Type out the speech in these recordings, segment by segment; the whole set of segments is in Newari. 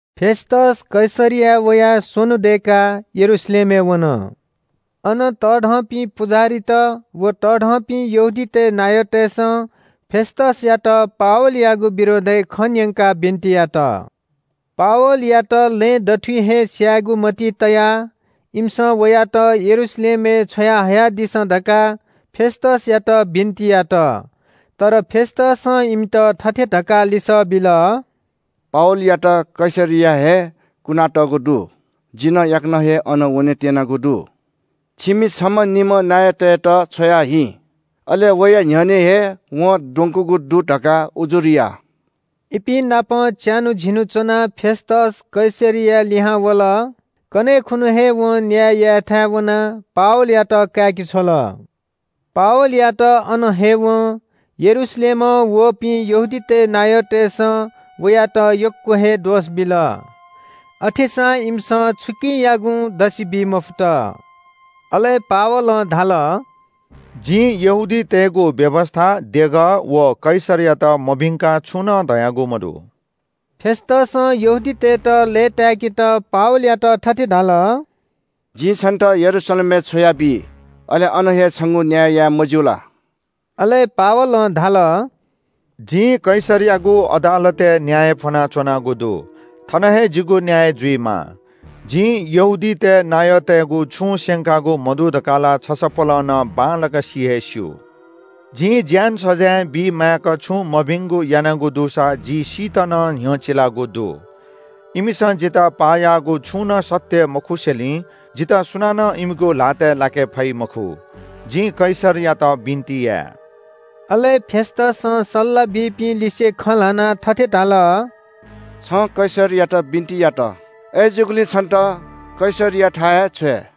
फेस्‍तस कैसरियाय् वयाः स्‍वन्‍हु दय्‌काः यरूशलेमय् वन। अन तःधंपिं पुजाहारीत व तःधंपिं यहूदीतय् नायःतय्‌सं फेस्‍तसयात पावलयागु विरोधय् खँ न्‍यंकाः बिन्‍ति यात। पावलयात लँय् दथुइ हे स्‍यायेगु मतिइ तयाः इमिसं वयात यरूशलेमय् छ्वयाहयादिसँ धकाः फेस्‍तसयात बिन्‍ति यात। तर फेस्‍तसं इमित थथे धकाः लिसः बिल – “पावलयात कैसरियाय् हे कुनातःगु दु। जि नं याकनं हे अन वनेत्‍यनागु दु। छिमि छम्‍हनिम्‍ह नायःतय्‌त छ्वयाहिँ। अले वया न्‍ह्यःने हे वं द्वंकूगु दु धकाः उजुर या।” इपिं नाप च्‍यान्‍हु झिन्‍हु च्‍वनाः फेस्‍तस कैसरियाय् लिहां वल। कन्‍हय् खुन्‍हु हे वं न्‍याय यायेथाय् वनाः पावलयात काय्‌के छ्वल। पावलयात अन हयेवं यरूशलेमं वःपिं यहूदीतय् नायःतय्‌सं वयात यक्‍व हे दोष बिल। अथेसां इमिसं छुकियागुं दसि बी मफुत। अले पावलं धाल – “जिं यहूदीतय्‌गु व्‍यवस्‍था, देगः, व कैसरयात मभिंकाः छुं नं धयागु मदु।” फेस्‍तसं यहूदीतय्‌त लय्‌ताय्‌केत पावलयात थथे धाल – “जिं छन्‍त यरूशलेमय् छ्वयाबी, अले अन हे छंगु न्‍याय याये, मज्‍यू ला?” अले पावलं धाल – “जिं कैसरयागु अदालतय् न्‍याय फ्‍वनाच्‍वनागु दु। थन हे जिगु न्‍याय जुइमाः। जिं यहूदीतय् नायःतय्‌गु छुं स्‍यंकागु मदु धकाः ला छसपोलं नं बांलाक सि हे स्‍यू। जिं ज्‍यान सजाँय बीमाय्‌क छुं मभिंगु यानागु दुसा जि सीत नं न्‍ह्यचिलागु दु। इमिसं जितः पाः याःगु छुं नं सत्‍य मखुसेंलि जितः सुनानं इमिगु ल्‍हातय् लाके फइ मखु। जिं कैसरयात बिन्‍ति याये।” अले फेस्‍तसं सल्‍लाह बीपिं लिसे खँ ल्‍हानाः थथे धाल – “छं कैसरयात बिन्‍ति यात। अय्‌जूगुलिं छन्‍त कैसरयाथाय् हे छ्वये।”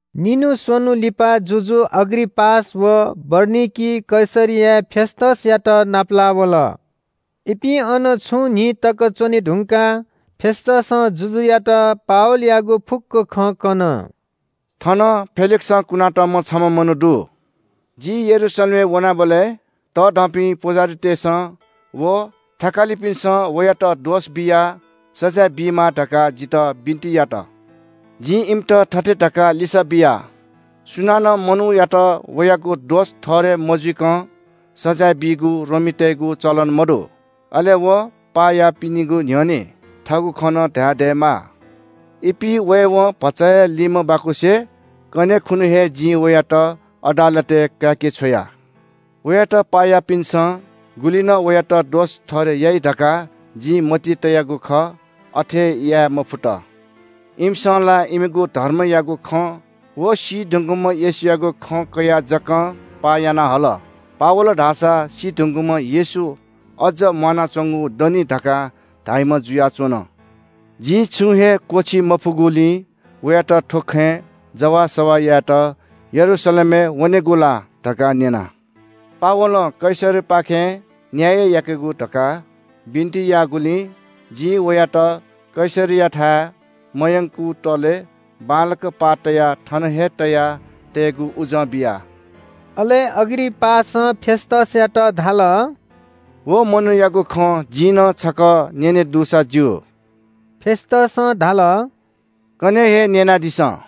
निन्‍हु स्‍वन्‍हु लिपा जुजु अग्रिपास व बरनिकी कैसरियाय् फेस्‍तसयात नापलाः वल। इपिं अन छुं न्‍हि तक च्‍वने धुंकाः फेस्‍तसं जुजुयात पावलयागु फुक्‍क खँ कन – “थन फेलिक्‍सं कुनातःम्‍ह छम्‍ह मनू दु। जि यरूशलेमय् वनाबलय् तःधंपिं पुजाहारीतय्‌सं व थकालिपिन्‍सं वयात दोष बियाः सजाँय बीमाः धकाः जितः बिन्‍ति यात। जिं इमित थथे धकाः लिसः बिया – ‘सुनानं मनूयात वयागु दोष ठहरय् मजुइकं सजाँय बीगु रोमीतय्‌गु चलन मदु। अले वं पाः याःपिनिगु न्‍ह्यःने थःगु खँ नं धाये दयेमाः।’ “इपिं वयेवं भचा हे लिमबाकुसे कन्‍हय् खुन्‍हु हे जिं वयात अदालतय् काय्‌के छ्वया। वयात पाः याःपिन्‍सं गुलि नं वयात दोष ठहरय् याइ धकाः जिं मतिइ तयागु खः, अथे याये मफुत। इमिसं ला इमिगु धर्मयागु खँ व सी धुंकूम्‍ह येशूयागु खँ कयाः जकं पाः याना हल। पावल धाःसा सी धुंकूम्‍ह येशू अज्‍जं म्‍वानाच्‍वंगु दनि धकाः धाइम्‍ह जुयाच्‍वन। जिं छुं हे क्‍वःछी मफुगुलिं वयात थ्‍व खँय् जवाःसवाः यायेत यरूशलेमय् वनेगु ला धकाः न्‍यना। पावलं कैसरपाखें न्‍याय याकेगु धकाः बिन्‍ति याःगुलिं जिं वयात कैसरयाथाय् मयंकुतले बांलाक पाः तयाः थन हे तया तयेगु उजं बिया।” अले अग्रिपासं फेस्‍तसयात धाल – “व मनूयागु खँ जिं नं छकः न्‍यने दुसा ज्‍यू।” फेस्‍तसं धाल – “कन्‍हय् हे न्‍यनादिसँ।”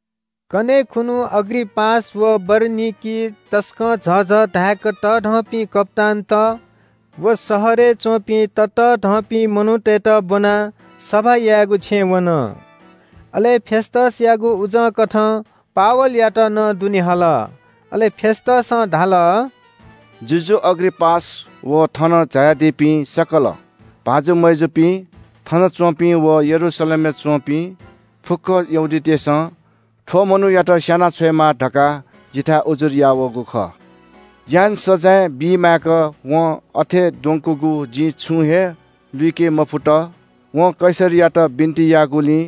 कन्‍हय् खुन्‍हु अग्रिपास व बरनिकी तसकं झःझः धाय्‌क तःधंपिं कप्‍तानत व शहरय् च्‍वंपिं ततःधंपिं मनूतय्‌त ब्‍वनाः सभा यायेगु छेँय् वन। अले फेस्‍तसयागु उजंकथं पावलयात नं दुने हल। अले फेस्‍तसं धाल – “जुजु अग्रिपास व थन झायादीपिं सकल भाजु मय्‌जुपिं, थनच्‍वंपिं व यरूशलेमय् च्‍वंपिं फुक्‍क यहूदीतय्‌सं थ्‍व मनूयात स्‍याना छ्वयेमाः धकाः जिथाय् उजुर याः वःगु खः। ज्‍यान सजाँय बीमाय्‌क वं अथे द्वंकूगु जिं छुं हे लुइके मफुत। वं कैसरयात बिन्‍ति याःगुलिं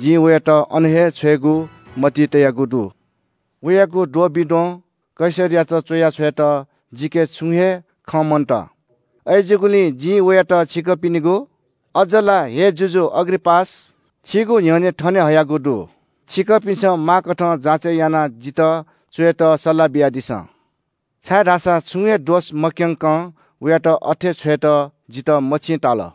जिं वयात अन हे छ्वयेगु मतिइ तयागु दु। “वयागु द्वंबिद्वं कैसरयात च्‍वया छ्वयेत जिके छुं हे खँ मन्‍त। अय्‌जूगुलिं जिं वयात छिकपिनिगु, अज्‍ज ला हे जुजु अग्रिपास, छिगु न्‍ह्यःने थने हयागु दु। छिकपिन्‍सं माःकथं जाँचय् यानाः जितः च्‍वयेत सल्‍लाह बियादिसँ, छाय्‌धाःसा छुं हे दोष मक्‍यंकं वयात अथे छ्वयेत जितः मछिं ताल।”